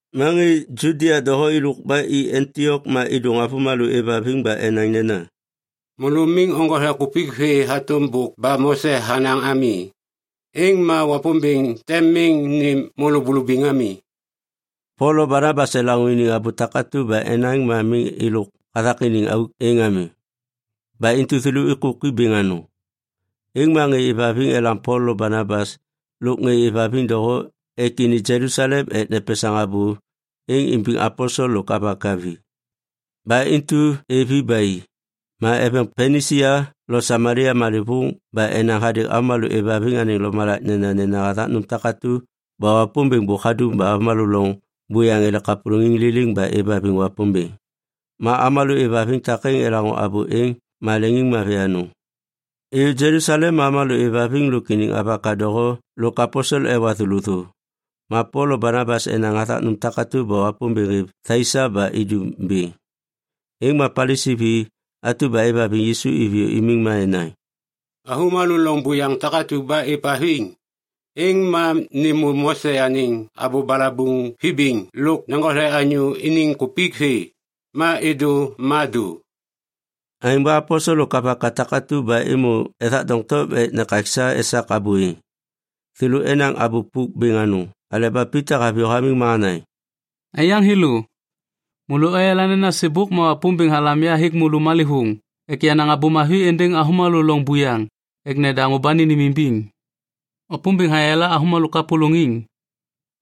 Ma ŋê Judia doho êlôk ba i Antiok ma êdôŋ avômalô êvhaviŋ ba enaŋ nena, “Môlô miŋ oŋgothe kupik vê hatôm bôk ba Mose hanaŋ ami, êŋ ma Wapômbêŋ tem miŋ nêm môlô bulubiŋ ami.” Pol lo Banabas elaŋô iniŋ abô takatu ba enaŋ ma miŋ êlôk hathak iniŋ auk êŋ ami. Ba intu thêlô êkôki bêŋ anôŋ. Êŋ ma ŋê êvhaviŋ elam Pol lo Banabas lôk ŋê êvhaviŋ doho ek ini Jelusalem ek nepesaŋ abô êŋ imbiŋ aposel lôk avaka vi. Ba intu êv i ba i. Ma eveŋ Pinisia lo Samalia malêvôŋ ba enaŋ hadêŋ avômalô êvhaviŋ anêŋ lomalak nenanena hathak nôm takatu ba Wapômbêŋ bôk hadum ba avômalô loŋ buyaŋ ele kapôlôŋiŋ liliŋ ba êvhaviŋ Wapômbêŋ. Ma avômalô êvhaviŋ takêŋ elaŋô abô êŋ ma leŋiŋmavi anôŋ. Êyô Jelusalem ma avômalô êvhaviŋ lôk iniŋ avaka doho lôk aposel ewa thêlô thô. Ma Pol lo Banabas enaŋ hathak nôm takatu ba Wapômbêŋ hêv thai sa ba idum bêŋ. Êŋ ma Palisi vi atu ba êvhaviŋ Yisu iviyô imiŋ ma enaŋ, “Avômalô loŋ buyaŋ takatu ba êvhaviŋ, êŋ ma nêmô Mose anêŋ abô balabuŋ vibiŋ lôk neŋgothe anyô iniŋ kupik vê. Ma êdô ma dô.” Aêŋ ba aposel lôk avaka takatu ba êmô ethak doŋtom ek nekaksa esak abô êŋ. Thêlô enaŋ abô pôk bêŋ anôŋ aleba Pita haviyô hamiŋ ma hanaŋ, “Aiyaŋ thêlô, môlô oyala nena sêbôk ma Wapômbêŋ halam ya hêk môlô malêvôŋ ek yanaŋ Abô Mavi êndêŋ avômalô loŋ buyaŋ ek nedaŋô ba nênêmimbiŋ. Wapômbêŋ hayala avômalô kapôlôŋiŋ.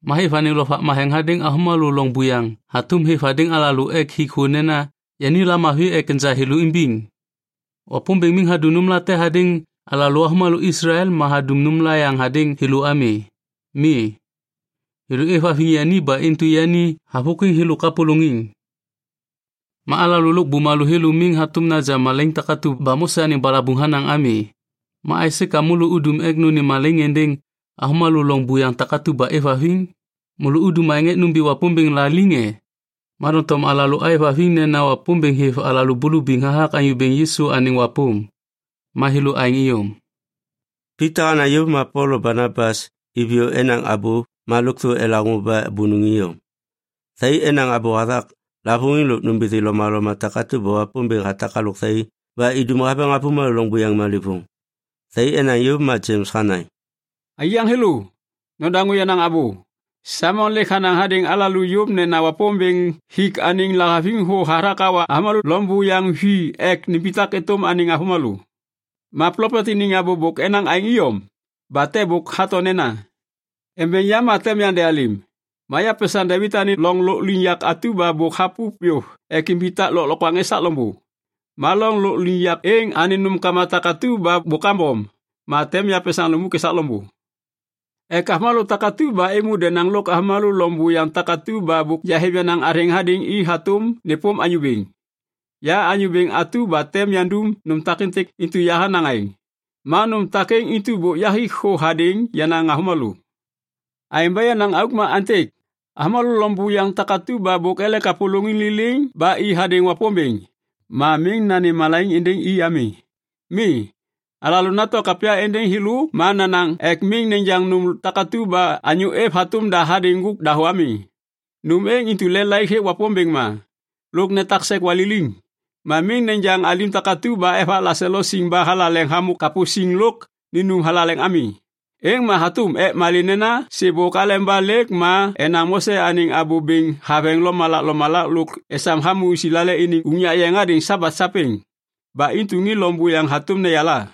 Ma hêv anêŋ Lovak Matheŋ hadêŋ avômalô loŋ buyaŋ hatôm hêv hadêŋ alalô ek hik thô nena yani lamavi ek enja thêlô imbiŋ. Wapômbêŋ miŋ hadum nômlate hadêŋ alalô avômalô Islael ma hadum nômla yaŋ hadêŋ thêlô ami. Mi, thêlô êvhaviŋ yani ba intu yani havôkwiŋ thêlô kapôlôŋiŋ. Ma alalô lôk bumalô thêlô miŋ hatôm naja malaiŋ takatu ba Mose anêŋ balabuŋ hanaŋ ami. Ma aisê ka môlô udum ek nônêm malaiŋ êndêŋ avômalô loŋ buyaŋ takatu ba êvhaviŋ? Môlô udum aêŋ ek nômbi Wapômbêŋ la liŋ e? Ma doŋtom alalô êvhaviŋ nena Wapômbêŋ hêv alalô bulubiŋ hathak Anyô Bêŋ Yisu anêŋ wapôm. Ma thêlô aêŋ iyom.” Pita hanaŋ yôv ma Pol lo Banabas iviyô enaŋ abô ma lôkthô elaŋô ba bônôŋ iyom. Thai enaŋ abô hathak lavôŋiŋ lôk nômbithi lomaloma takatu ba Wapômbêŋ hatak halôk thai baheŋiŋ ba idum haveŋ avômalô loŋ buyaŋ malêvôŋ. Thai enaŋ yôv ma Jems hanaŋ, “Aiyaŋ thêlô, nodaŋô yenaŋ abô. Saimon lêk hanaŋ hadêŋ alalô yôv nena Wapômbêŋ hik anêŋ lahaviŋ thô hathak hawa avômalô loŋ buyaŋ vi ek nimbitak êtôm anêŋ avômalô. Ma plopet iniŋ abô bôk enaŋ aêŋ iyom. Ba te bôk hato nena, “‘Embeŋ yam ma tem yandealêm, ma yapesaŋ Devit anêŋ loŋ lôkliŋyak atu ba bôk hapu yôv ek imbitak lôklokwaŋ esak loŋbô. Ma loŋ lôkliŋyak êŋ anêŋ nômkama takatu ba bôk kambom, ma tem yapesaŋ lukmuk esak loŋbô. Ek avômalô takatu ba êmô denaŋ lôk avômalô loŋ buyaŋ takatu ba bôk yahêv yenaŋ athêŋ hadêŋ i hatôm nêpôm Anyô Bêŋ. Ya Anyô Bêŋ atu ba tem yandum nôm takêntêk, intu yahanaŋ aêŋ. Ma nôm takêŋ intu bôk yahik thô hadêŋ yenaŋ avômalô.’ “Aêŋ ba yenaŋ auk ma aêntêk. Avômalô loŋ buyaŋ takatu ba bôk ele kapôlôŋiŋ liliŋ ba i hadêŋ Wapômbêŋ ma miŋ nanêm malaiŋ êndêŋ i ami. Mi, alalô nato kapya êndêŋ thêlô ma nanaŋ ek miŋ nejaŋ nôm takatu ba anyô êv hatôm da hadêŋ ŋgôk dahô ami, nôm êŋ intu lelaik hêk Wapômbêŋ ma. Lôk netak sek waliliŋ, ma miŋ nejaŋ alim takatu ba evak laselo siŋ ba thalaleŋ hamô kapô siŋ lôk ninum thalaleŋ ami. Êŋ ma hatôm. Ek malê nena sêbôk aleba lêk ma enaŋ Mose anêŋ abô bêŋ haveŋ lomalak lomalak lôk esam hamô Islael iniŋ unyak yeŋ hadêŋ Sabat sapêŋ. Ba intu ŋê loŋ buyaŋ hatôm neyala.”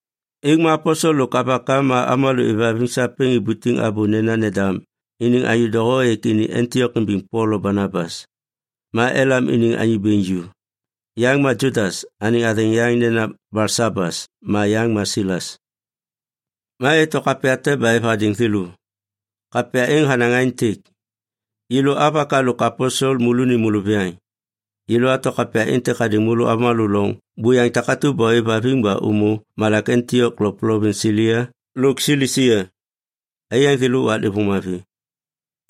Êŋ ma aposel lôk avaka ma avômalô êvhaviŋ sapêŋ ibutiŋ abô nena nendam iniŋ anyô doho ek ini Antiok imbiŋ Pol lo Banabas. Ma elam iniŋ anyô bêŋ ju. Yaŋ ma Judas, anêŋ athêŋ yaŋ nena Balsabas, ma yaŋ ma Silas. Ma eto kapya te ba êv hadêŋ thêlô. Kapya êŋ hanaŋ aêntêk. Yêlô avaka lôk aposel, môlônim môlôviyaŋ, yêlô ato kapya êntêk hadêŋ môlô avômalô loŋ buyaŋ takatu ba ôêvhaviŋ ba ômô malak Antiok lôk plovins Silia lôk Silisia. Aiyaŋ thêlô, waklêvôŋ mavi.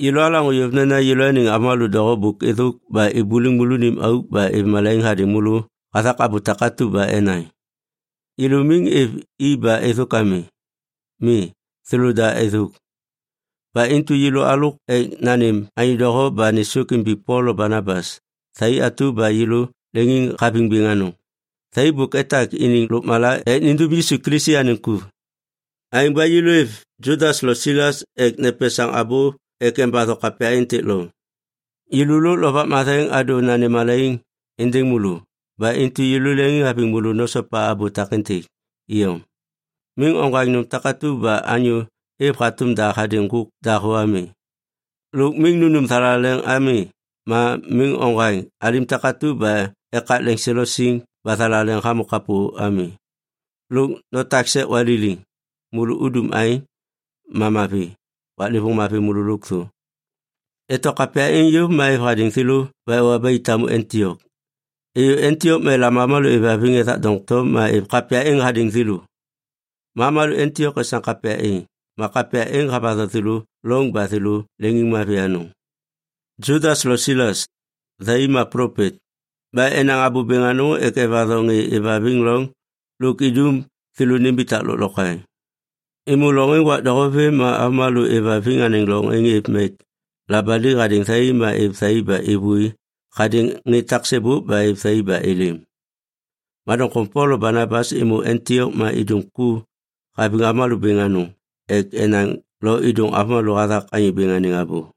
Yêlô alaŋô yôv nena yêlôaniŋ avômalô doho bôk êthôk ba ibuliŋ môlônim auk ba êv malaiŋ hadêŋ môlô hathak abô takatu ba enaŋ. Yêlô miŋ êv i ba êthôk ami. Mi, thêlôda êthôk. Ba intu yêlô alôk ek nanêm anyô doho ba nêsôk imbiŋ Pol lo Banabas, thai atu ba yêlô leŋiŋhaviŋ bêŋ anôŋ. Thai bôk etak iniŋ lôkmala ek nindum Yisu Kilisi anêŋ ku. Aêŋ ba yêlô êv Judas lo Silas ek nepesaŋ abô ek embatho kapya êntêk loŋ. Yêlô lôk Lovak Matheŋ adô nanêm malaiŋ êndêŋ môlô. Ba intu yêlô leŋiŋhaviŋ môlô nosopa abô takêntêk iyom. Miŋ oŋgwaŋ nôm takatu ba anyô êv hatôm da hadêŋ ŋgôk dahô ami. Lôk miŋ nunum thalaleŋ ami ma miŋ oŋgwaŋ alim takatu ba ekak leŋselo siŋ ba thalaleŋ hamô kapô ami, lôk notak sek waliliŋ. Môlô udum aêŋ, ma mavi. Waklêvôŋ mavi môlô lôkthô. Eto kapya êŋ yôv ma êv hadêŋ thêlô ba ewa ba i tamu Antiok. Êyô Antiok ma elam avômalô êvhaviŋ ethak doŋtom ma êv kapya êŋ hadêŋ thêlô. Ma avômalô Antiok esam kapya êŋ, ma kapya êŋ havatho thêlô loŋ ba thêlô leŋiŋmavi anôŋ. Judas lo Silas, thai ma plopet. Ba enaŋ abô bêŋ anôŋ ek evatho ŋê êvhaviŋ loŋ lôk idum thêlô nimbitak lôklokwaŋ. Êmô loŋ êŋ wak doho vêm ma avômalô êvhaviŋ anêŋ loŋ êŋ êv mek labali hadêŋ thai ma êv thai ba êvôi hadêŋ ŋê taksêbôk ba êv thai ba êlêm. Ma doŋtom Pol lo Banabas êmô Antiok ma idum ku haviŋ avômalô bêŋ anôŋ ek enaŋ lo êdôŋ avômalô hathak Anyô Bêŋ anêŋ abô.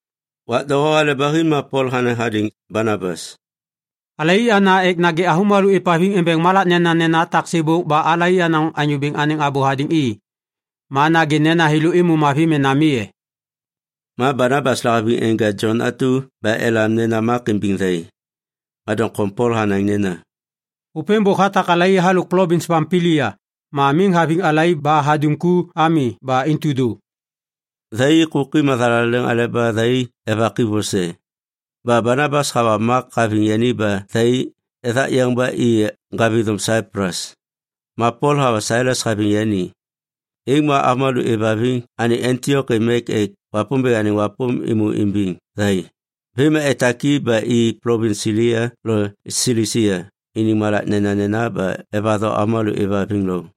Wak doho hale ba hi ma Pol hanaŋ hadêŋ Banabas, “Alai ana ek nagê avômalô êvhaviŋ embeŋ malak nenanena taksêbôk ba alai anaŋ Anyô Bêŋ anêŋ abô hadêŋ i. Ma nagê nena thêlô êmô mavi mena mi e?” Ma Banabas lahaviŋ enja Jon atu ba elam nena Mak imbiŋ thai, ma doŋtom Pol hanaŋ nena, “Ôpêŋ bôk hatak alai halôk plovins Pampilia ma miŋ haviŋ alai ba hadum ku ami. Ba intu dô.” Thai êkôki mathalaleŋ aleba thai evaki vose. Ba Banabas hawa Mak haviŋ yani ba thai ethak yeŋ ba i ŋgavithôm Saiplus. Ma Pol hawa Silas haviŋ yani. Êŋ ma avômalô êvhaviŋ anêŋ Antiok êv mek ek Wapômbêŋ anêŋ wapôm êmô imbiŋ thai. Vêm ma etak i ba i plovins Silia lôk Silisia iniŋ malak nenanena ba evatho avômalô êvhaviŋ loŋ.